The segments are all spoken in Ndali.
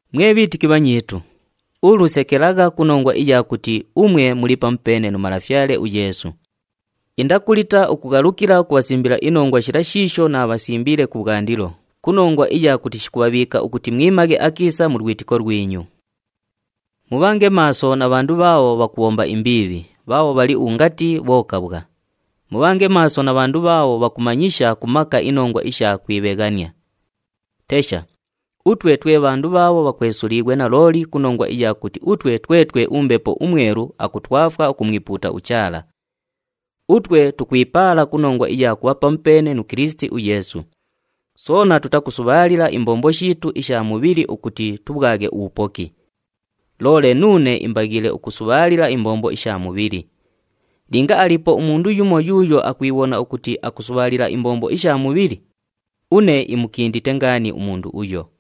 Mwe bhiitiki bhanyiitu, ulu sekelagha ku nongwa iya kuti umwe muli pamupeene nu Malafyale uYeesu. Indakulita ukughalukila ukubhasimbila inongwa shila shiisho naabhasimbiile kubhwandilo, ku nongwa iya kuti shikubhabhiika ukuti mwimaghe akiisa mu lwitiko lwinyu. Mubhange maaso na bhandu bhaabho bhakubhomba imbiibhi, bhaabho bhali ungati bhokabhwa. Mubhange maaso na bhandu bhaabho bhakumanyisha ku maka inongwa isha kwibheghania. Tesha, utwe twe bhandu bhaabho bhakwesuliighwe nalooli ku nongwa iya kuti utwe twetwe uMbepo uMwelu akutwafwa ukumwipuuta uChaala. Utwe tukwipaala ku nongwa iya kubha pamupeene nu Kilisiti uYeesu, soona tutakusubhaalila imbombo shiitu isha mubhili ukuti tubhwaghe ubhupoki. Loole nuune imbaghiile ukusubhaalila imbombo isha mubhili. Linga aliipo umundu yumo yuuyo akwibhona ukuti akusubhaalila imbombo isha mubhili, une imukindite ngaani umundu uyo.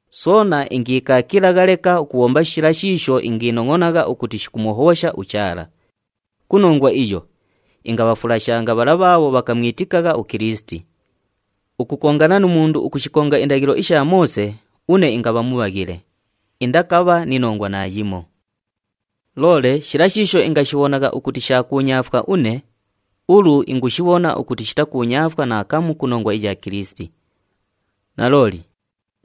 Soona ingiikaakilagha leka ukubhomba shila shiisho ingiinongʼonagha ukuti shikumuhobhosha uChaala. Ku nongwa iyo, ingabhafulashanga bhala bhaabho bhakamwitikagha uKilisiti. Ukukongana nu mundu ukushikonga indaghilo isha Moose, une ingabha mubhaghile, indakabha ni nongwa naayimo. Loole shila shiisho ingashibhonagha ukuti sha kuunyaafwa une, ulu ingushibhona ukuti shitakuunyaafwa naakamu ku nongwa iya Kilisiti. Nalooli,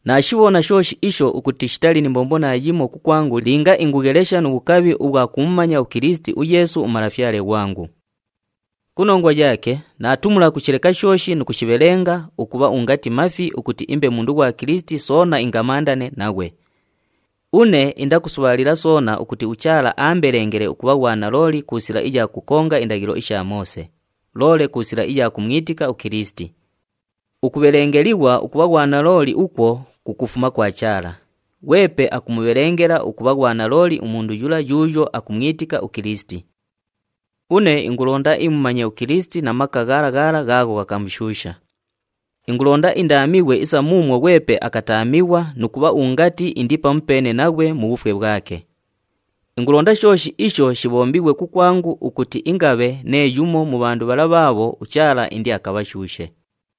naashibhona shooshi isho ukuti shitali ni mbombo naayimo kukwangu linga ingughelesha nu bhukabhi ubhwa kumumanya uKilisiti uYeesu uMalafyale ghwangu. Ku nongwa yaake, naatumula ukushileka shooshi nu kushibhelenga ukubha ungati mafi ukuti imbe mundu ghwa Kilisiti, soona ingamandane naghwe. Une indakusubhaalila soona ukuti uChaala aambelengele ukubha ghwanalooli ku sila iya kukonga indaghilo isha Moose, loole ku sila iya kumwitika uKilisiti. Ukubhelengelighwa ukubha ghwanalooli ukwo kukufuma kwa Chaala, ghwepe akumubhelengela ukubha ghwanalooli umundu yula yuuyo akumwitika uKilisiti. Une ingulonda imumanye uKilisiti na maka ghala ghala ghaagho ghakamushuusha. Ingulonda indaamighwe isa muumwo ghwepe akataamighwa nu kubha ungati indi pamupeene naghwe mu bhufwe bhwake. Ingulonda shooshi isho shibhombighwe kukwangu ukuti ingabhe nee yumo mu bhandu bhala bhaabho uChaala indiakabhashuushe.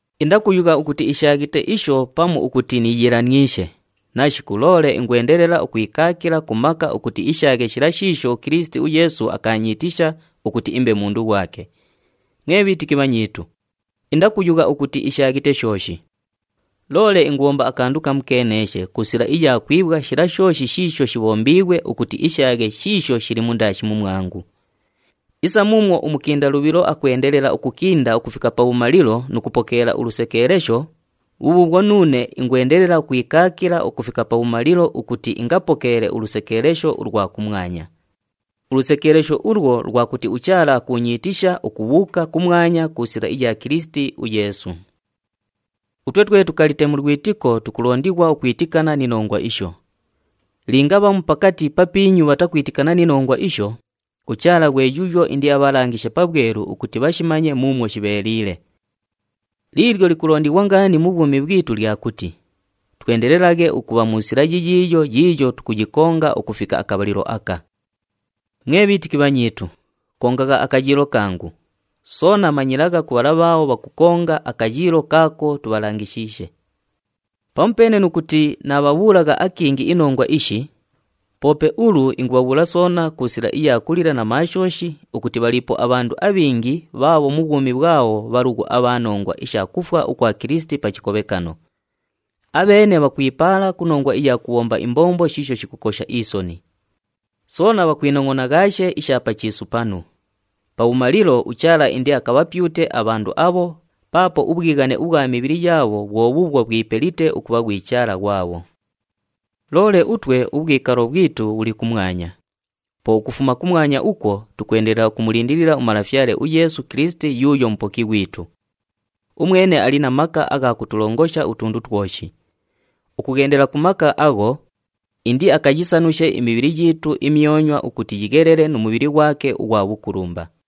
Indakuyugha ukuti ishaaghite isho pamu ukuti niiyiilaniishe, nashiku, loole ingwendelela ukwikaakila ku maka ukuti ishaaghe shila shiisho uKilisiti uYeesu akaanyiitisha ukuti imbe mundu ghwake. Mwe bhiitiki bhanyiitu, indakuyugha ukuti ishaaghite shooshi. Loole ingubhomba akandu kamukeeneeshe ku sila iya kwibhwa shila shooshi shiisho shibhombiighwe ukuti ishaaghe shiisho shili mundaashi mumwangu. Isa muumwo umukinda lubhilo akwendelela ukukinda ukufika pabhumalilo nu kupokeela ulusekeelesho, bhubhuubhwo nuune ingwendelela ukwikaakila ukufika pabhumalilo ukuti ingapokeele ulusekeelesho ulwa kumwanya. Ulusekeelesho ulwo lwa kuti uChaala akuunyiitisha ukubhuuka kumwanya ku sila iya Kilisiti uYeesu. Utwe twe tukalite mu lwitiko tukulondighwa ukwitikana ni nongwa isho. Linga bhamu pakati papiinyu bhatakwitikana ni nongwa isho, uChaala ghwe yuuyo indiabhalangishe pabhwelu ukuti bhashimanye muumwo shibheeliile. Liilyo likulondighwa ngaani mu bhwumi bhwitu lya kuti twendelelaghe ukubha mu sila yiyiiyo yiiyo tukuyikonga ukufika akabhalilo aka. Mwe bhiitiki bhanyiitu, kongagha akayiilo kangu, soona manyilagha ku bhala bhaabho bhakukonga akayiilo kaako tubhalangishiishe. Pamupeene nu kuti naabhabhuulagha akingi inongwa ishi, poope ulu ingubhabhuula soona ku sila iya kulila na maashooshi ukuti bhaliipo abhandu abhingi bhaabho mu bhwumi bhwabho bhalughu abha nongwa isha kufwa ukwa Kilisiti pa chikobhekano. Abheene bhakwipaala ku nongwa iya kubhomba imbombo shiisho shikukosha isoni. Soona bhakwinongʼonaghaashe isha pa chiisu panu. Pabhumalilo uChaala indiakabhapyute abhandu abho paapo ubhwighane ubhwa mibhili yaabho bhwo bhuubhwo bhwipelite ukubha ghwi chaala ghwabho. Loole utwe ubhwikalo bhwitu bhuli kumwanya. Po ukufuma kumwanya ukwo, tukwendelela ukumulindilila uMalafyale uYeesu Kilisiti yuuyo Mupoki ghwitu. Umwene ali na maka agha kutulongosha utundu twoshi. Ukughendela ku maka agho, indiakayisanushe imibhili yiitu imyonywa ukuti yighelele nu mubhili ghwake ughwa bhukulumba.